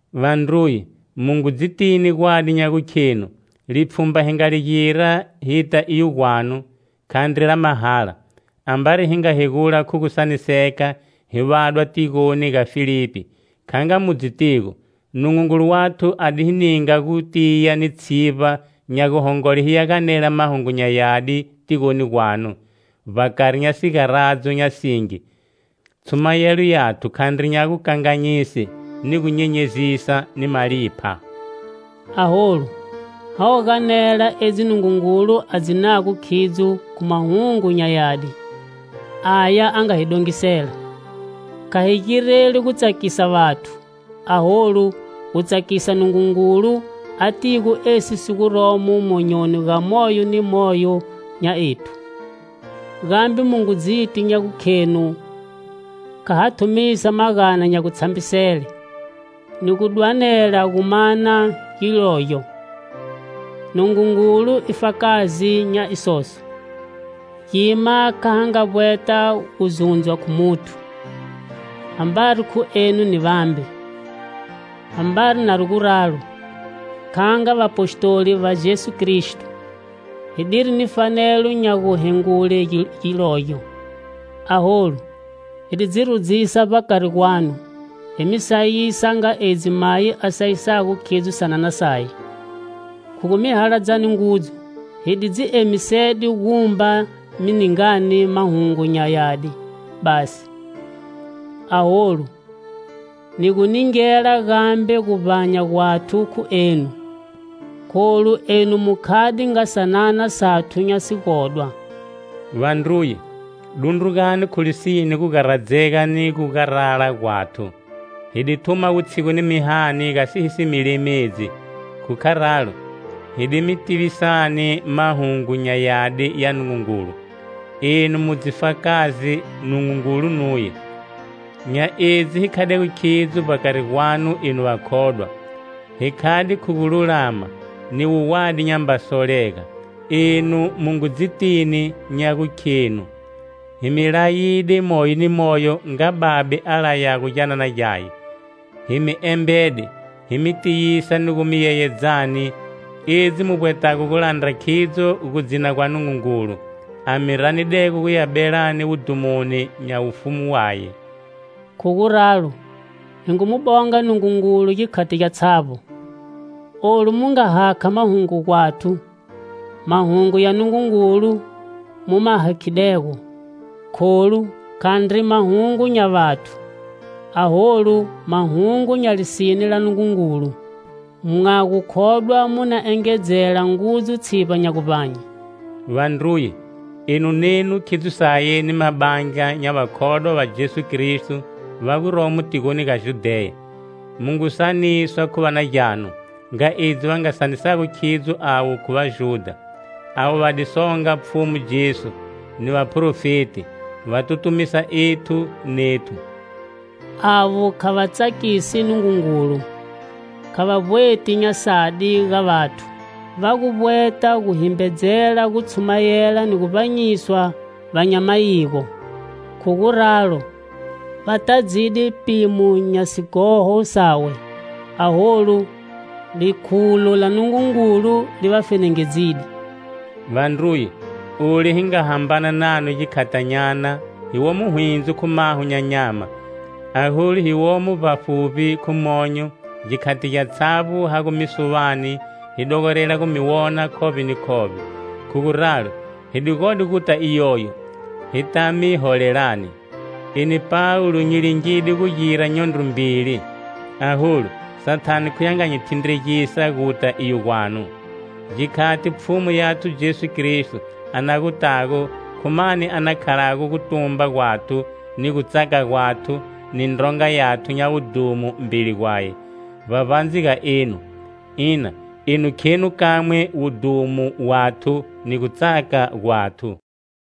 Vandruye, mu ngu dzitini gwadi nya gukhenu lipfhumba hi nga li gira hita iyo gwanu, khandri la mahala. Ambari hi nga hegula khu gu saniseka, hi vadwa tigoni ga Filipi, kha nga mu dzitigo, Nungungulu wathu a di hi ninga gutiya ni tshivba nya guhongole hiya ganela Mahungu nya Yadi tigoni gwanu, vbakari nya sigaradzo nya singi. Tshumayelo yathu khandri nya gukanganyise, ni gu nyenyezisa ni malipha. Aholu, ha gu ganela edzi Nungungulu a dzinago khidzo khu Mahungu nya Yadi, aya a nga hi dongisela. Kha hi gireli gu tsakisa vathu, aholu, gu tsakisa Nungungulu, atigo esi si guromo monyoni ga moyo ni moyo nya ethu. Gambe mu ngu dziti nya gukhenu kha ha thumisa magana nya gutshambisele, ni gu dwanela gu mana gilogyo. Nungungulu i fakazi nya isoso. Gima kha ha vbweta gu zundzwa khu muthu, ambari khu enu ni vambe. Ambari nari guralo, kha nga vapostoli va Jesu Kristo, hi diri ni fanelo nya guhengule gilogyo. Aholu, hi di dzi rudzisa vbakari gwanu hi mi sayisa nga edzi mayi a sayisago khidzo sanana saye. Khu gu mi haladzani ngudzu, hi di dzi emisede gumba mi ningani Mahungu nya Yadi basi, aholu, ni gu ningela gambe guvbanya gwathu khu enu, kholu enu mu khade nga sanana sathu nya sigodwa. Vandruye, dundrugani khu lisine gugaradzega ni gugarala gwathu. Hi di thuma wutshigu ni mihani gasi hi si mi lemedzi, khu kharalo, hi di mi tivisani Mahungu nya Yadi ya Nungungulu. Enu mu dzifakazi, Nungungulu nuye, nya edzi hi khadego khidzo vbakari gwanu, enu vakhodwa. Hi khade khu gululama, ni wuwadi nyamba solega. Enu mu ngu dzitini nya gukhenu hi mi layide moyo ni moyo nga babe a layago gyanana gyaye. Hi mi embede, hi mi tiyisa ni gu mi yeyedzani, edzi mu vbwetago gu landra khidzo gudzina gwa Nungungulu, a mi ranidego guya belani wudhumoni nya Wufumu waye. Khu guralo, hi ngu mu bonga Nungungulu gikhati gyatshavbo. Olu mu nga hakha Mahungu gwathu, Mahungu ya Nungungulu mu ma hakhidego. Kholu, khandri mahungu nya vathu, aholu, mahungu nya lisine la Nungungulu. Mwa gu khodwa mu na engedzela ngudzu tshivba nya guvbanye. Vandruye, enu nenu khidzo saye ni mabandla nya vakhodwa va Jesu Kristo va guromo tigoni ga Judheya. Mu ngu saniswa khu va na gyanu nga edzi va nga saniswago khidzo avo khu vaJudha. Avo va di songa Pfhumu Jesu, ni vaprofeti, va tutumisa ethu nethu. Avo kha va tsakisi Nungungulu, kha va vbweti nya sadi ga vathu. Va gu vbweta gu himbedzela gu tshumayela ni gu vbanyiswa va nya mayigo. Khu guralo, va tadzide pimo nya sighoho sawe. Aholu, likhulo la Nungungulu li va fenengedzide. Vandruye, olu hi nga hambana nanu gikhatinyana hi womo hwindzo khu maho nya nyama, aholu, hi womo vbafuvbi khu myonyo, gikhati gyatshavbo ha gu mi suvani hi dogorela gu mi wonani khovbe ni khovbe. Khu guralo, hi di gode guta iyoyo, hita mi holelani. Eni Pawulo nyi di lingide gu gira nyondro mbili, aholu, Sathane khuye a nga hi thindregisa guta iyo gwanu. Gikhati Pfhumu yathu Jesu Kristo a na gutago, khu mani a na khalago gutumba gwathu, ni gutsaka gwathu, ni ndronga yathu nya wudhumo mbeli gwaye, vbavbandze ga enu? Ina, enu khenu kamwe wudhumo wathu ni gutsaka gwathu.